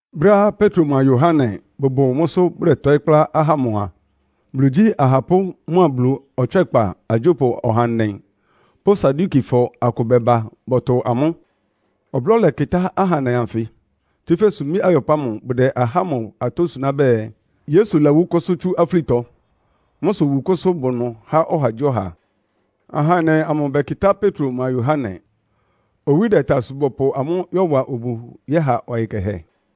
Brɛ́á Petro mʋa Yohane bʋbʋ mʋ́sʋ́ bʋdɛtɔɩ́ kplá ahá ámʋ a, Bulu igyí ahapʋ́ mʋ́a Bulu ɔtswɛ́kpa agyópʋ ɔhandɛ pʋ́ Sadukifɔ akʋ bɛba bɔtʋ amʋ́. Ɔblɔ́ lɛkɩtá ahandɛ anfɩ. Tsúfɛ́ sumbí ayɔpʋ́ ámʋ bʋdɛ ahá ámʋ atɔ́ suná bɛɛ, Yesu lawú kʋ́sʋ́ tsú afúlitɔ. Mʋ́ sʋ wukʋ́sʋ́ bʋ ɩnʋ há ɔhagyíɔha. Ahandɛ amʋ bɛkɩtá Petro mʋa Yohane. Owí dɛta sʋ bɔpʋ amʋ́ yɔ́wa obu yɛ́ha ɔyɩ kɛhɛ.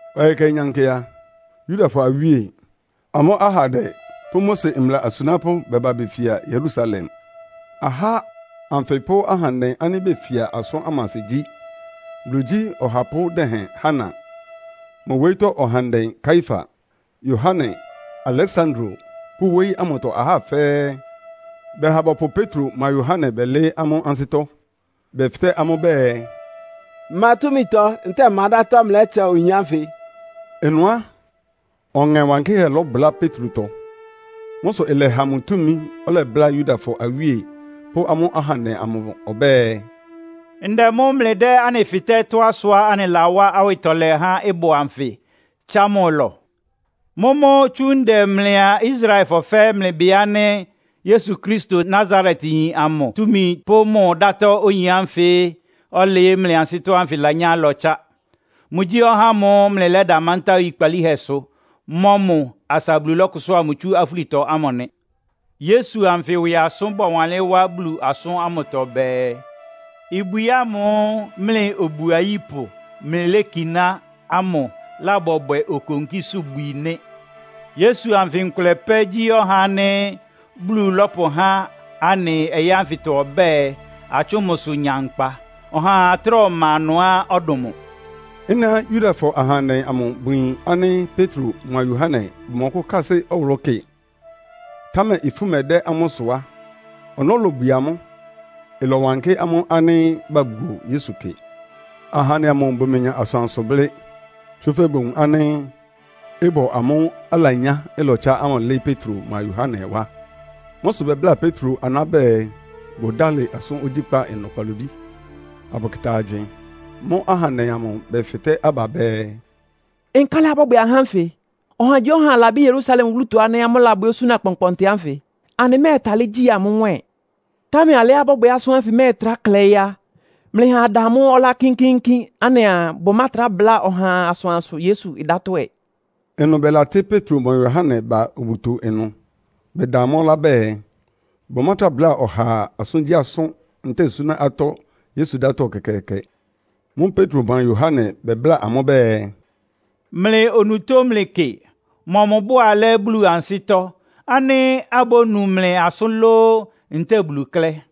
Ɔyɩ kɛhɛ nyankɩ a, Yudafɔ awíe, amʋ́ ahandɛ pʋ́ Mose mbla asunápʋ́ bɛba befia Yerusalem. Ahá ánfɩ pʋ́ ahandɛ ánɩ́ befia asʋ́n ámʋ asɩ gyí; Bulu igyí ɔhapʋ́ dɛhɛn Hana, mʋ wóyítɔ́ ahandɛ Kaiafa, Yohane, Aleksandro pʋ́ wóyí ámʋtɔ ahá fɛ́ɛ́. Bɛha bɔpʋ Petro mʋa Yohane bɛlɩɩ́ amʋ́ ansɩ́tɔ́, bɛfɩtɛ́ amʋ́ bɛɛ, “Ma túmitɔ ntɛ́ɛ ma dátɔ́ mlɩlɛ́tsa oyin ánfɩ?” Ɩnʋ á, Ɔŋɛ Wankɩ́hɛ́ lɔbʋlá Petrotɔ. Mʋ́ sʋ ɩlɛha mʋ túmi ɔlɛbláa Yudafɔ awíe pʋ́ amʋ́ ahandɛ amʋ ɔbɛ́ɛ, “Ndɛ mʋ́ mlɩdɛ́ anɩ fɩtɛ́ tɔ́á sʋá anɩlawá awɩtɔlɛ há ɩbɔ anfɩ, tsá mʋ ɩlɔ? Mʋ́mʋ́ tsú ndɛ mlɩa Israelfɔ fɛ́ɛ́ mlɩbɩ ánɩ́ Yesu Kristo, Nasaretyin amʋ túmi pʋ́ mʋ dátɔ́ oyin ánfɩ ɔ́lɩɩ́ mlɩ ansɩ́tɔ́ ánfɩ lanyá ɩlɔtsá. Mʋgyí ɔhá ámʋ́ʋ́ mlɩlɛ́da mántá oyikpalíhɛsʋ mɔ́ mʋ asa Bulu lɔ́kʋsʋ́a mʋ tsú afúlitɔ ámʋ nɩ. Yesu anfɩ ɩwɩ asʋ́n bɔwanlɩ́n wá Bulu asʋ́n ámʋtɔ bɛɛ, ‘Ibwi ámʋ́ʋ́ mlɩ obu ayípʋ mlɩlékiná ámʋ lábɔbwɛ okonkísʋ́bwi nɩ́.’ Yesu anfɩ nkʋlɛ pɛ́ gyí ɔhá ánɩ́ Bulu lɔ́pʋhá anɩ ɔyɩ́ ánfɩtɔ ɔbɛ́ɛ, atsʋ́ʋn mʋsʋ nya nkpa. Ɔhaa trá ɔma ɩnʋá ɔdʋn mʋ.” Ɩ́nɩá Yudafɔ ahandɛ amʋ bʋyin ánɩ́ Petro mʋa Yohane bʋmɔkʋ́kásɩ́ ɔwʋlʋ́ kɩ, támɛ ifú mɛdɛ́ amʋ́ sʋ á, ɔnɔ́ lobwie amʋ́. Ɩlɔwankɩ́ amʋ́ ánɩ́ babuo Yesu kɩ. Ahandɛ amʋ bʋmenya asʋansʋ blɩ́. Tsúfɛ́ bowun ánɩ́ ɩbɔ amʋ́ʋ́ alanyá ɩlɔtsá ámʋ lɩ́ɩ́ Petro mʋa Yohane wá. Mʋ́ sʋ bɛbláa Petro aná bɛɛ, bʋdálɩ asʋ́n ogyíkpá ɩnʋ kpalobí, abʋkɩta agywɩɩn. Mʋ́ʋ́ ahandɛ amʋ bɛfɩtɛ́ aba bɛɛ, “Nkálɩ abɔ́bwɛ ahá ánfɩ? Ɔhagyíɔha labɩ́ Yerusalem wúlutɔ ánɩ́ amʋ́ labwɛ́ osúna kpɔnkpɔntɩ ánfɩ. Anɩmɛ́ɛtalɩ́ gyi mʋ́ nwɛ́ɛn. Támɛ alɩá ɩbɔ́bwɛ asʋ́n ánfɩ mɛ́ɛtrá klɛɩ́ á, mlɩha ada amʋ́ ɔlá kínkíínkín anɩaa bʋmátra bláa ɔhaa asʋansʋ Yesu dátɔ́ ɛ.” Ɩnʋ bɛlatɩ́ Petro mʋa Yohane ba obuto ɩnʋ, bɛda amʋ́ ɔlá bɛɛ, bʋmátra bláa ɔhaa asʋ́ngyíasʋ́n ntɛ́ɛ súná atɔ́ Yesu dátɔ́ ɛkɛkɛɛkɛ. Mʋ́ʋ́ Petro mʋa Yohane bɛbláa amʋ́ bɛɛ, “Mlɩ onutó mlɩkɩ. Mɔmʋ bʋ alɛ́ Bulu ansɩ́tɔ́, ánɩ́ abónu mlɩ asʋ́n lóó, ntɛ́ɛ Bulu klɛ́?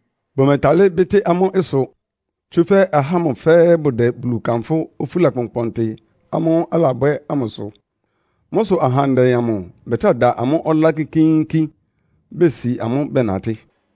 Bʋmɛtalɩ́ bɩ́tɩ́ amʋ́ ɩsʋ, tsúfɛ́ ahá ámʋ fɛ́ɛ́ bʋdɛ Bulu kanfʋ́ ofúla kpɔnkpɔntɩ ámʋ́ʋ́ alabwɛ́ ámʋ sʋ. Mʋ́ sʋ ahandɛ amʋ bɛtrá da amʋ́ ɔlá kínkíínkín, besi amʋ́ bɛnatɩ́.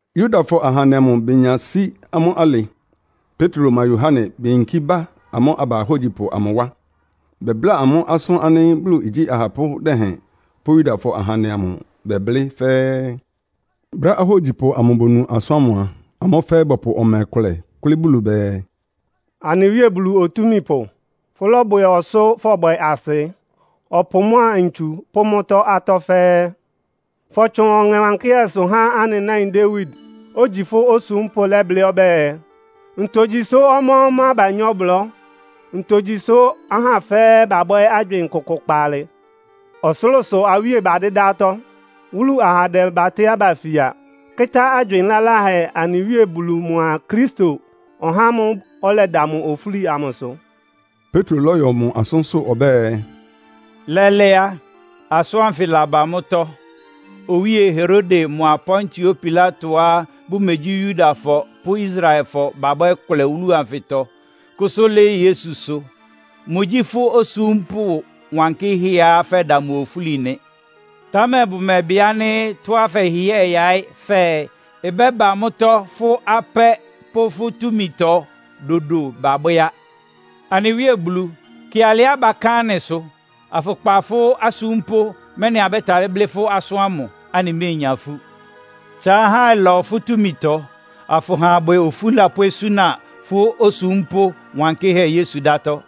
Yudafɔ ahandɛ amʋ benya sí amʋ́ alɩ, Petro mʋa Yohane beyinkí ba amʋ́ aba ahógyipʋ amʋ wá. Bɛbláa amʋ́ asʋ́n ánɩ́ Bulu igyí ahapʋ́ dɛhɛn pʋ́ Yudafɔ ahandɛ amʋ bɛblɩ́ fɛ́ɛ́. Brɛ́á ahógyipʋ amʋ bonu asʋ́n ámʋ a, amʋ́ fɛ́ɛ́ bɔpʋ ɔmɛ kʋlɛ kʋ́lɩ́ Bulu bɛɛ, “Anɩ Wíe Bulu Otúmípʋ, fʋ́lɔ́bwɛ ɔsʋ́ fɔbwɛ asɩ, ɔpʋ mʋ́a ntsu pʋ́ mʋ́tɔ́ atɔ́ fɛ́ɛ́. Fɔtsʋn Ɔŋɛ Wankɩ́hɛ́sʋ há anɩ náin Dawid, ogyi fʋ́ osúmpʋ́ lɛ́blɩ́ ɔbɛ́ɛ, ‘Ntogyi sʋ́ ɔmá-ɔmá banyá ɔblɔ́? Ntogyi sʋ́ ahá fɛ́ɛ́ babwɛ́ agywɩɩn kʋkʋ kpaalɩ? Ɔsʋlʋ́sʋ awíe badɩ́dá atɔ́. Wúlu ahandɛ batɩ́ aba fia, kɩ́tá agywɩɩn laláhɛ anɩ Wíe Bulu mʋa Kristo, (ɔhá ámʋ́ʋ́ ɔlɛda mʋ ofúli) amʋsʋ.’” Petro lɔ́yɔ mʋ asʋ́nsʋ́ ɔbɛ́ɛ, “Lɛ́lɛ́ á, asʋ́n ánfɩ laba mʋ́tɔ́. Owíe Herode mʋa Pontio Pilatoá bʋmegyí Yudafɔ pʋ́ Israelfɔ babwɛ́ kʋlɛ wúlu anfɩtɔ, kʋ́sʋ́ lɩ́ɩ́ Yesusʋ. Mʋgyí fʋ́ osúmpʋ́ wankɩ́hɛ́á fɛ́da mʋ ofúli nɩ. Támɛ bʋmɛbɩ ánɩ́ tɔ́á fɛhɩhɩ́ɛ yaɩ́ fɛɛ ɩbɛ́ba mʋ́tɔ́ fʋ́ apɛ́ pʋ́ fʋ́ túmitɔ dodo babwɛ́ á. Anɩ Wíe Bulu, kɩ alɩá baká anɩsʋ, afʋkpa fʋ́ asúmpʋ́, mɛ́nɩ abɛ́talɩ́ blɩ́ fʋ́ asʋ́n ámʋ, anɩméenya ifú. Tsa ahá ɩlɔ fʋ́ túmitɔ, afʋha abwɛ ofúla pʋ́ osúna fʋ́ osúmpʋ́ wankɩ́hɛ́ Yesu dátɔ́.”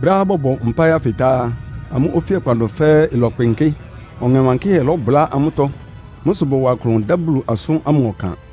Brɛ́á bɔbɔ mpáɩ ánfɩ tá á, amʋ́ ofíakpa ɩnʋ fɛ́ɛ́ ɩlɔkpɩnkɩ́. Ɔŋɛ Wankɩ́hɛ́ lɔ́bʋlá amʋ́tɔ́. Mʋ́ sʋ bɔwa klʋn dá Bulu asʋ́n ámʋ ɔkan.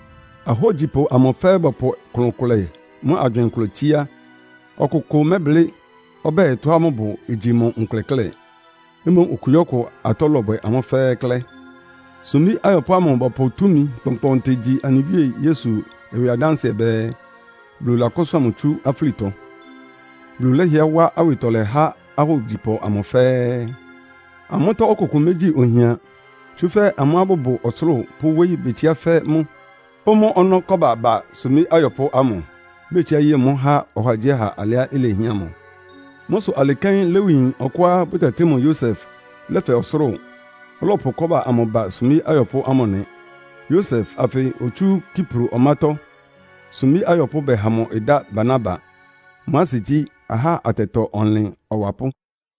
Ahógyipʋ amʋ fɛ́ɛ́ bɔpʋ klʋn kʋlɛ mʋ́a agywɩɩn kʋlɛ tsíá. Ɔkʋkʋ mɛ́blɩ́ ɔbɛ́ɛ tɔ́á mʋbʋ igyi mʋ nkʋlɛ klɛ́. Mboún okugyíɔkʋ atɔ́ lɔbwɛ amʋ́ fɛ́ɛ́ klɛ́. Sumbí ayɔpʋ́ ámʋ bɔpʋ túmi kpɔnkpɔɔnkpɔntɩ gyi anɩ Wíe Yesu ɩwɩ adánsɩɛ bɛɛ, Bulu lakʋ́sʋ́a mʋ tsú afúlitɔ. Bulu lɛ́hɩɛ wá awɩtɔlɛ há ahógyipʋ amʋ fɛ́ɛ́. Amʋ́tɔ́ ɔkʋkʋ mégyi ohian, tsúfɛ́ amʋ́á bʋbʋ ɔsʋlʋ́ʋ pʋ́ wóyí betsiá fɛ́ mʋ́, pʋ́ mʋ́ ɔnɔ́ kɔ́ba ba sumbí ayɔpʋ́ ámʋ, betsiá ye mʋ́ há ɔhagyíɔha alɩá ilehián mʋ. Mʋ́ sʋ alɩ kɛ́n Lewiyin ɔkʋá bʋtɛtɩ́ mʋ Yosef lɛ́fɛ ɔsʋlʋ́ʋ, ɔlɔpʋ kɔ́ba amʋ ba sumbí ayɔpʋ́ ámʋ nɩ. Yosef anfɩ otsú Kipro ɔmátɔ́, sumbí ayɔpʋ́ bɛha mʋ ɩdá Barnaba, (mʋ́ asɩ gyí, “Ahá atɛtɔ-ɔnlɩn ɔwapʋ́.”)